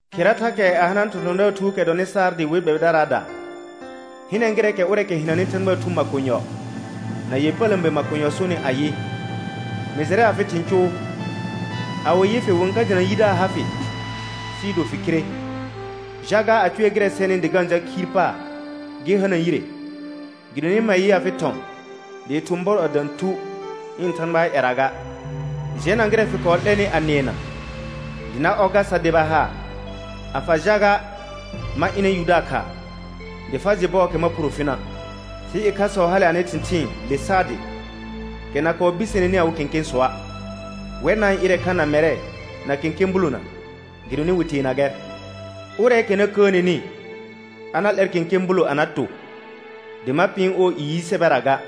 Khera thakɛ a hana thɔ̃thɔ̃daar thuukɛ dɔnɩ Saardɩ we gbɛbɩdaraada. Hɩnɛ gɩrɛɛkɛ ʋrɛɛkɛ hɩnanɩ Thãgbaa Thu makonyɔ na ƴepələ̃be makonyɔ sonɩ ayɩ: Mɩ jɩrɛ afɩ thɩ̃ cʋʋ. A wɩ yɩ fɩ wɩ-n ka jɩna yidaar ha fɩ sɩɩ do fɩ khire. Jaga a cʋɛ gɩrɛ sɛnɩ sɩ dɩ ga-n jal khiir paar gɩ hana yire, gɩdonɩ ma yɩ afɩ thɔ̃ dɩɩ thʋ̃ bɔr a dã thu ɩ̃ Thãgbaa ƴɛra ga. Jɛna gɩrɛ fɩ kɔɔ 'lɛnɩ a nɩɛna, dɩ na ɔ gar sa deba haar. A fa jaga, ma ɩnɛ yudaar khaa, dɩ fa jɩ bɔɔkɛ ma phuro fina'. Sɩ ɩkhasɔ hale anɩ thɩ̃thɩɩn le Saardɩ, kɛ na kɔɔ biseneni awɩ kẽkẽsɔa'. Wɛr na-n ɩrɛ kha na mɛrɛ na kẽkẽ bulona gɩdonɩ wɩ teena gɛr. Ʋrɛɛkɛ na kəəneni a na 'lɛr kẽkẽ bulo a na to, dɩ ma pɩɩn ɔɔ i yi sɛbɛra ga,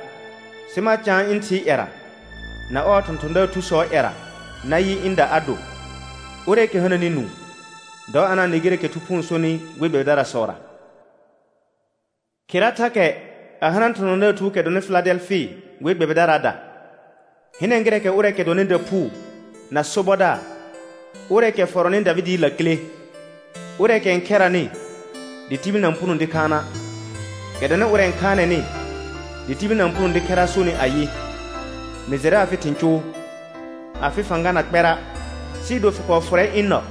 sɩ ma caan ɩ̃ Thɩɩ ƴɛra na ɔɔ thɔ̃thɔ̃daar thusɔɔ ƴɛra nayɩ ɩ̃da a do. Ʋrɛɛkɛ hananɩ nũu, dɔ a na-n nɩ gɩrɛɛkɛ Thu Phuu n sonɩ we gbɛbɩdarasɔra. Khera thakɛ a hana thɔ̃thɔ̃daar thuukɛ dɔnɩ Fɩladɛlfɩ we gbɛbɩdaraada. Hɩnɛ gɩrɛɛkɛ ʋrɛɛkɛ dɔnɩ daphuu na sobɔdaar, ʋrɛɛkɛ fɔrɔnɩ Davɩdɩɩ lakile, ʋrɛɛkɛ n khɛranɩ dɩ tibil na-n puno dɩ khaana', kɛ dɔnɩ ʋrɛ n khaanɛnɩ dɩ tibil na-n puno dɩ khɛra' sonɩ ayɩ: Mɩ jɩrɛ afɩ thɩ̃ cʋʋ. Afɩ fãga na kpɛra', sɩɩ do fɩ kɔɔ fʋrɛ ɩ̃ nɔ,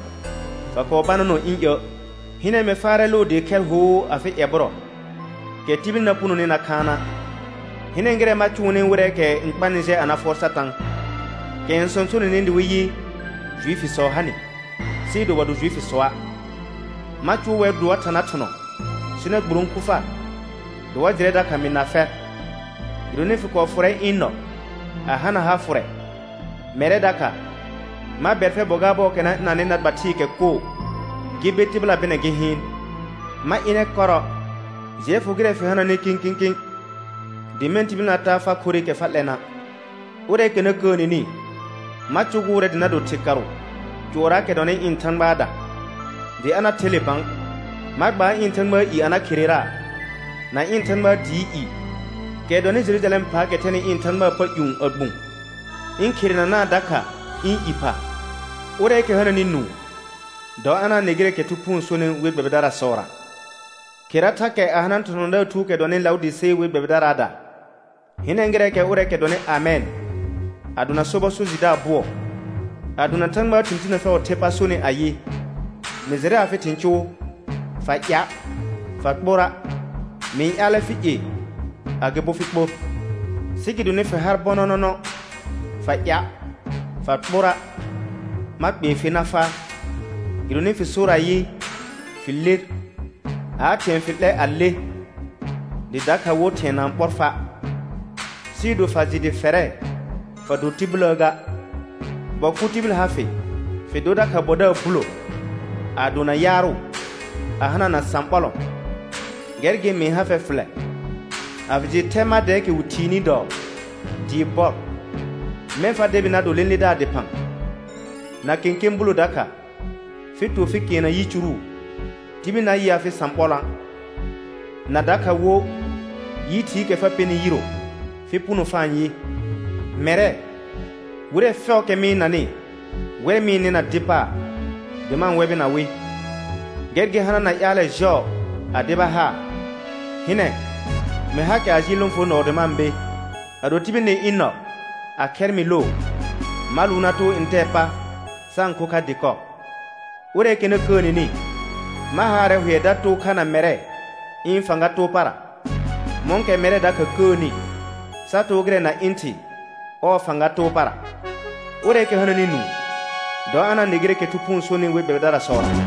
fa kɔɔ bananɔ ɩ̃ iə'. Hɩnɛ mɩ faarɛ loo dɩɩ khɛr hoo afɩ ƴɛbʋrɔ, kɛ tibil na punoni na khaana'. Hɩnɛ gɩrɛ ma cʋʋnɩ wɩrɛɛkɛ n kpanɩ jɛ a na fʋɔr Satã, kɛ n sõsonenɩ dɩ wɩ yɩ, Juifisɔ ha nɩ, sɩɩ do wa do Juifisɔa', ma cʋʋ wɛr dɩ wa tha na thʋnɔ sɩ na gburõku far, dɩ wa jɩrɛ dakha mɩ na fɛr. Gɩdonɩ fɩ kɔɔ fʋrɛ ɩ̃ nɔ a hana ha fʋrɛ, mɛrɛ dakha ma bɛr fɛr bɔ gaar bɔɔkɛ na ɩnanɩ na gba thɩɩkɛ koo gɩ be tɩbɩla bɩnɛ gɩ hɩɩn. Ma ɩnɛ kɔrɔ. Jɩɛ fʋ gɩrɛ fɩ hananɩ kĩkĩkĩ, dɩ mɛ̃ tibil na taa far khorɩkɛ fa 'lɛna'. Ʋrɛɛkɛ na kəəneni ma cʋgʋʋrɛ dɩ na do thɩkarʋ cʋɔrraakɛ dɔnɩ ɩ̃ Thãgbaada, dɩ a na the le bã. Ma gbaar ɩ̃ Thãgbaa i a na khereraa, na ɩ̃ Thãgbaa dɩɩ i, kɛ dɔnɩ Jerujalɛm phaakɛ thɛnɩ ɩ̃ Thãgbaa pa ƴũ a gbũ, ɩ̃ kherenanaa dakha ɩ̃ i pha. Ʋrɛɛkɛ hananɩ nũu, dɔ a na-n nɩ gɩrɛɛkɛ Thu Phuu n sonɩ we gbɛbɩdarasɔra. Khera thakɛ a hana thɔ̃thɔ̃daar thuukɛ dɔnɩ Laʋdɩse we gbɛbɩdaraada. Hɩnɛ gɩrɛɛkɛ ʋrɛɛkɛ dɔnɩ Amɛn, a dona sobɔ so jɩdaar bʋɔ, a dona Thãgbaa thɩ̃ tinə fɛʋʋ the pa sonɩ ayɩ: Mɩ jɩrɛ afɩ thɩ̃ cʋʋ. Fa ɩa', fa kpora'; mɩ-n ƴaalɛ fɩ ie agɩbo fɩ kpor. Sɩ gɩdonɩ fɩ har bɔnɔnɔnɔ, fa ɩa', fa kpora', ma kpee fer na faa. Gɩdonɩ fɩ sor ayɩ, fɩ ler aa, thɩ̃ɛ fɩ 'lɛ a le, dɩ dakha wo thɩ̃ɛ na-n ɓɔr fa', sɩɩ do fa jɩ dɩ fɛrɛ, fa do tibiləə ga, bɔ kʋ tibil ha fɩ, fɩ dor dakha bɔdaar bulo, a dona yaarʋ, a hanana sãɓɔlɔ̃. Gɛr gɩ mɩ-n ha fɛr fɩlɛ, a fɩ jɩ thɛ mar dɛɛkɛ wɩ thiini dɔɔ dɩɩ bɔr, mɛ̃ fa debi na do lẽledaar dɩphã; na kẽkẽ bulo dakha fɩ to fɩ kɛɛna yicuru, tibil na yɩ afɩ sãɓɔlɔ̃a'; na dakha wo yi thɩɩkɛ fa pɛnɩ yiro fɩ puno fa-n yɩ. Mɛrɛ, wɩrɛ fɛʋʋkɛ mɩ-n nanɩ wɛr mɩ-n nɩna dɩ paar dɩ ma-n wɛbɩna wɩ. Gɛr gɩ hanana ƴaalɛ jɔɔ a deba haar. Hɩnɛ, mɩ hakɛ a jɩɩl lõfonɔɔ dɩ ma-n be. Ado tibil nɩ ɩ̃ nɔ, a khɛr mɩ loo, ma lʋʋn na too ntɛɛ pa sa-n kho kha dɩkɔ. Ʋrɛɛkɛ na kəəneni ma haarɛ hʋɛ da too kha na mɛrɛ ɩ̃ fãga too para, mɔ̃kɛ mɛrɛ dakha kəəni sa too gɩrɛ na ɩ̃ Thɩ ɔɔ fãga too para. Ʋrɛɛkɛ hananɩ nũu, dɔ a na-n nɩ gɩrɛɛkɛ Thʋ Phuu n sonɩ we gbɛbɩdarasɔra.